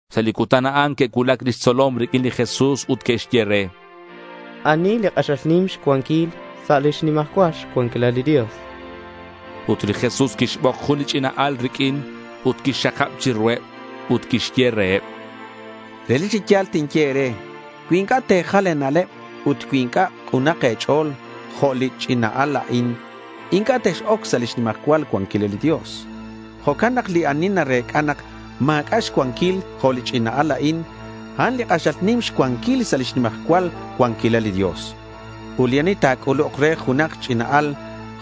Sa' li cutan a'an que'cuulac lix tzolom riq'uin li Jesús ut que'xye re: —¿Ani li k'axal nim xcuanquil sa' lix nimajcual cuanquilal li Dios?— Ut li Jesús quixbok jun li ch'ina al riq'uin ut quixxakab chiruheb. Ut quixye reheb: —Relic chi ya̱l tinye e̱re cui inc'a' te̱jal e̱na'leb ut cui inc'a' k'unak e̱ch'o̱l jo' li ch'ina al a'in, inc'a' tex-oc sa' lix nimajcual cuanquilal li Dios. Jo'can nak li ani narec'a nak ma̱c'a' xcuanquil jo' li ch'ina al a'in, a'an li k'axal nim xcuanquil sa' lix nimajcual cuanquilal li Dios. Ut li ani ta̱c'uluk re junak ch'ina al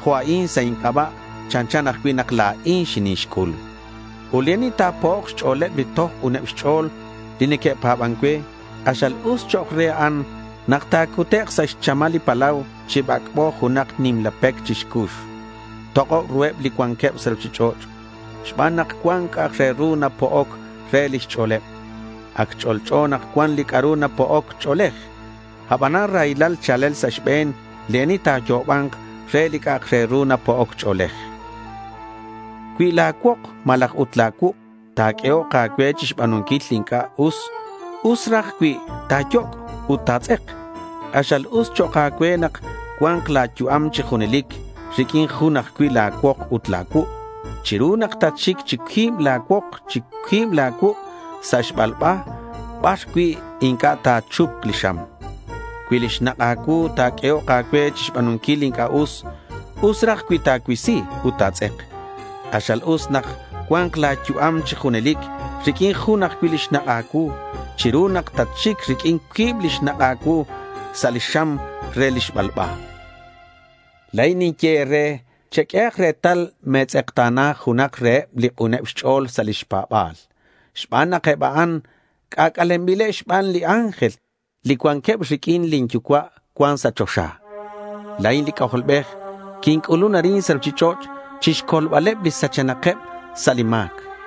jo' a'in sa' inc'aba' chanchan ajcui' nak la̱in xinixc'ul. Ut li ani ta̱po'ok xch'o̱leb li toj k'uneb xch'o̱l li neque'pa̱ban cue, k'axal raj us chok' re a'an nak ta̱cutek' sa' xchamal li palau chi bac'bo junak nimla pec chixcux. Tok'ob ruheb li cuanqueb sa' ruchich'och' xban nak cuan c'a' re ru napo'oc re lix ch'o̱leb. Ac ch'olch'o nak cuan li c'a'ru napo'oc ch'o̱lej. Abanan raylal cha̱lel sa' xbe̱n li ani ta̱yo'oba̱nk re li c'a' re ru ta̱po'ok ch'o̱lej. Cui la̱ cuok malaj ut la̱ cuuk' ta̱q'uehok a̱cue chixba̱nunquil li c'a'ru inc'a' us, us raj cui ta̱yoc' ut ta̱tz'ek. K'axal us chok' a̱cue nak cua̱nk la̱ yu'am chi junelic riq'uin jun ajcui' la̱ cuok ut la̱ cuuk' chiru nak tatxic chi cuib la̱ cuok chi cuib la̱ cuuk' sa' li xbalba bar cui' inc'a' ta̱chupk li xam. Cui li xnak' a̱cuu ta̱q'uehok a̱cue chixba̱nunquil li inc'a' us, us raj cui ta̱cuisi ut ta̱tz'ek. K'axal us nak ta̱cua̱nk la̱ yu'am chi junelic riq'uin jun ajcui' li xnak' a̱cuu chiru nak tatxic riq'uin cuib li xnak' a̱cuu sa' li xam re li xbalba. La̱in ninye e̱re cheq'uehak retal me̱tz'ekta̱na junak reheb li k'uneb xch'o̱l sa' lix pa̱ba̱l xban nak eb a'an c'ac'alenbileb xbaneb li ángel, li cuanqueb riq'uin lin Yucua' cuan sa' choxa. La̱in li C'ajolbej quinc'ulun arin sa' ruchich'och' chixcolbaleb li sachenakeb sa' li ma̱c.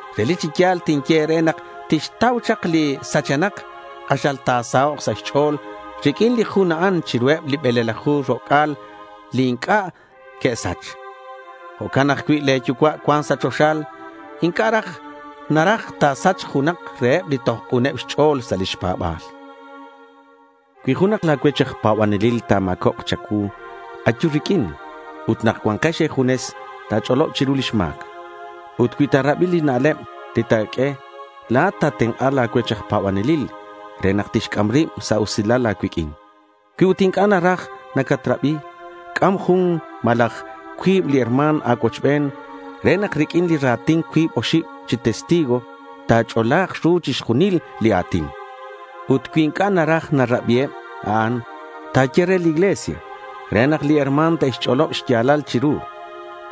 Relic chi ya̱l tinye e̱re nak tixtau chak li sachenak, k'axal ta̱sahok' sa' xch'o̱l riq'uin li jun a'an chiruheb li bele̱laju ro'c'a̱l li inc'a' que'sach. Jo'can ajcui' le̱ Yucua' cuan sa' choxa inc'a' naraj nak ta̱sachk junak reheb li toj k'uneb xch'o̱l sa' lix pa̱ba̱l. Cui junak la̱ cuech aj pa̱banelil ta̱ma̱cobk cha̱cuu, ayu riq'uin ut nak cua̱nkex e̱junes, ta̱ch'olob chiru lix ma̱c. Ut cui ta̱rabi li xna'leb li ta̱q'ue, la̱at xatenk'a la̱ cuech aj pa̱banelil re nak tixc'am rib sa' usilal a̱cuiq'uin. Cui ut inc'a' naraj nacatrabi, c'am jun malaj cuib li herma̱n a̱cuochben re nak riq'uin li ra̱tin cuib oxib chi testigo, ta̱ch'ola̱k ru chixjunil li a̱tin. Ut cui inc'a' naraj ta̱rabiheb a'an, ta̱ye re li iglesia re nak li herma̱n te'xch'olob xya̱lal chiru.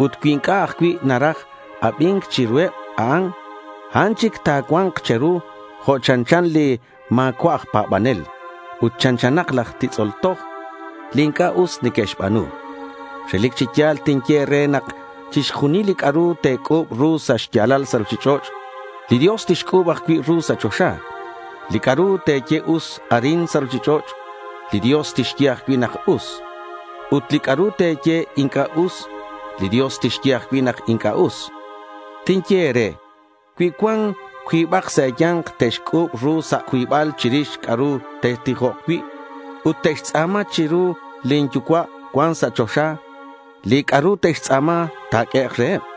Ut cui inc'a' ajcui' naraj abi̱nc chiruheb a'an, a'an chic ta̱cua̱nk che̱ru jo' chanchan li ma̱cua'ak aj pa̱banel ut chanchanak laj titz'ol toj li inc'a' us neque'xba̱nu. Relic chi ya̱l tinye e̱re nak chixjunil li c'a'ru te̱c'u̱b ru sa' xya̱lal sa' ruchich'och', li Dios tixc'u̱b ajcui' ru sa' choxa. Li c'a'ru te̱ye us arin sa' ruchich'och', li Dios tixye ajcui' nak us. Ut li c'a'ru te̱ye inc'a' us, li Dios tixye ajcui' nak inc'a' us. Tinye e̱re cui cuan cuibak sa' e̱ya̱nk te'xc'u̱b ru sa' cuibal chirix c'a'ru te'tijok cui', ut te'xtz'a̱ma chiru lin Yucua' cuan sa' choxa, li c'a'ru te'xtz'a̱ma ta̱q'uehek' reheb.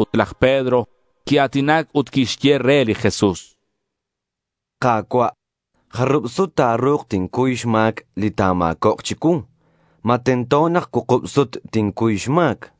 Ut laj Pedro quia̱tinac ut quixye re li Jesús: —Ka̱cua', ¿jarub sut ta̱ru̱k tincuy xma̱c li ta̱ma̱cobk chicuu? ¿Ma tento nak cuukub sut tincuy xma̱c?—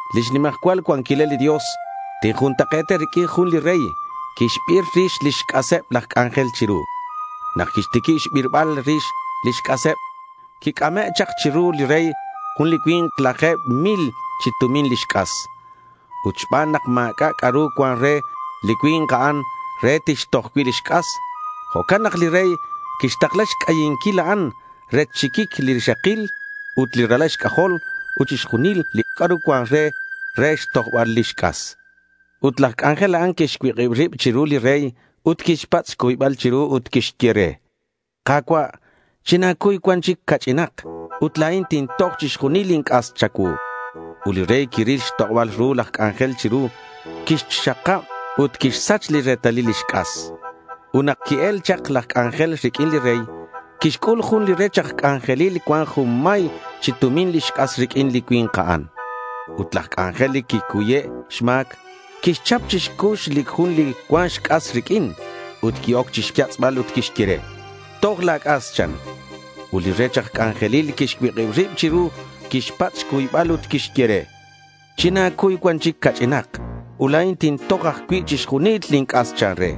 Lix nimajcual cuanquilal li Dios tinjuntak'e̱ta riq'uin jun li rey quixbir rix lix c'aseb laj c'anjel chiru. Nak quixtiquib xbirbal rix lix c'aseb, quic'ame' chak chiru li rey jun li cui̱nk laje̱b mil chi tumin lix c'as. Ut xban nak ma̱c'a' c'a'ru cuan re li cui̱nk a'an re tixtoj cui' lix c'as, jo'can nak li rey quixtakla xc'ayinquil a'an rech xxiquic li rixakil, ut li ralal xc'ajol ut chixjunil li c'a'ru cuan re, re xtojbal lix c'as. Ut laj c'anjel a'an quixcuik'ib rib chiru li rey ut quixpatz' xcuybal chiru ut quixye re: —Ka̱cua', china̱cuy cuan chic ca'ch'inak, ut la̱in tintoj chixjunil lin c'as cha̱cuu.— Ut li rey quiril xtok'oba̱l ru laj c'anjel chiru. Quirach'ab ut quixsach li retalil lix c'as. Ut nak qui-el chak laj c'anjel riq'uin li rey, quixc'ul jun li rech aj c'anjelil cuan junmay chi tumin lix c'as riq'uin li cui̱nk a'an. Ut laj c'anjel, li quicuye' xma̱c, quixchap chi xcux li jun li cuan xc'as riq'uin ut qui-oc chixyatz'bal ut quixye re: —Toj la̱ c'as, chan. Ut li rech aj c'anjelil quixcuik'ib rib chiru, quixpatz' xcuybal ut quixye re: —China̱cuy cuan chic ca'ch'inak ut la̱in tintoj ajcui' chixjunil lin c'as, chan re.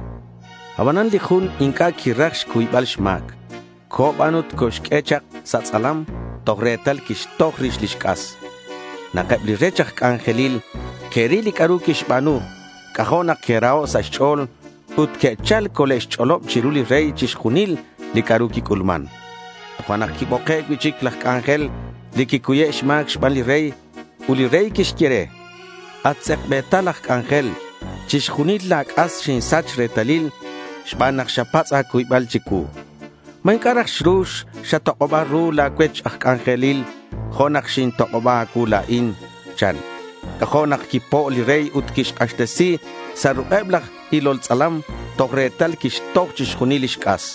Abanan li jun inc'a' quiraj xcuybal xma̱c. Co̱ ban ut coxq'ue chak sa' tz'alam toj retal quixtoj rix lix c'as. Nak eb li rech aj c'anjelil que'ril li c'a'ru quixba̱nu, c'ajo' nak que'raho' sa' xch'o̱l. Ut que'chal cole'xch'olob chiru li rey chixjunil li c'a'ru quic'ulman. Tojo'nak quiboke' cui'chic laj c'anjel li quicuye' xma̱c xban li rey. Ut li rey quixye re: —At tz'ekbe̱tal aj c'anjel, chixjunil la̱ c'as xinsach retalil xban nak xapatz' a̱cuybal chicuu. ¿Ma inc'a' raj xru xatok'oba ru la̱ cuech aj c'anjelil jo' nak xintok'oba a̱cuu la̱in? chan. C'ajo' nak quipo' li rey ut quixk'axtesi sa' ruk'eb laj ilol tz'alam toj retal quixtoj chixjunil lix c'as.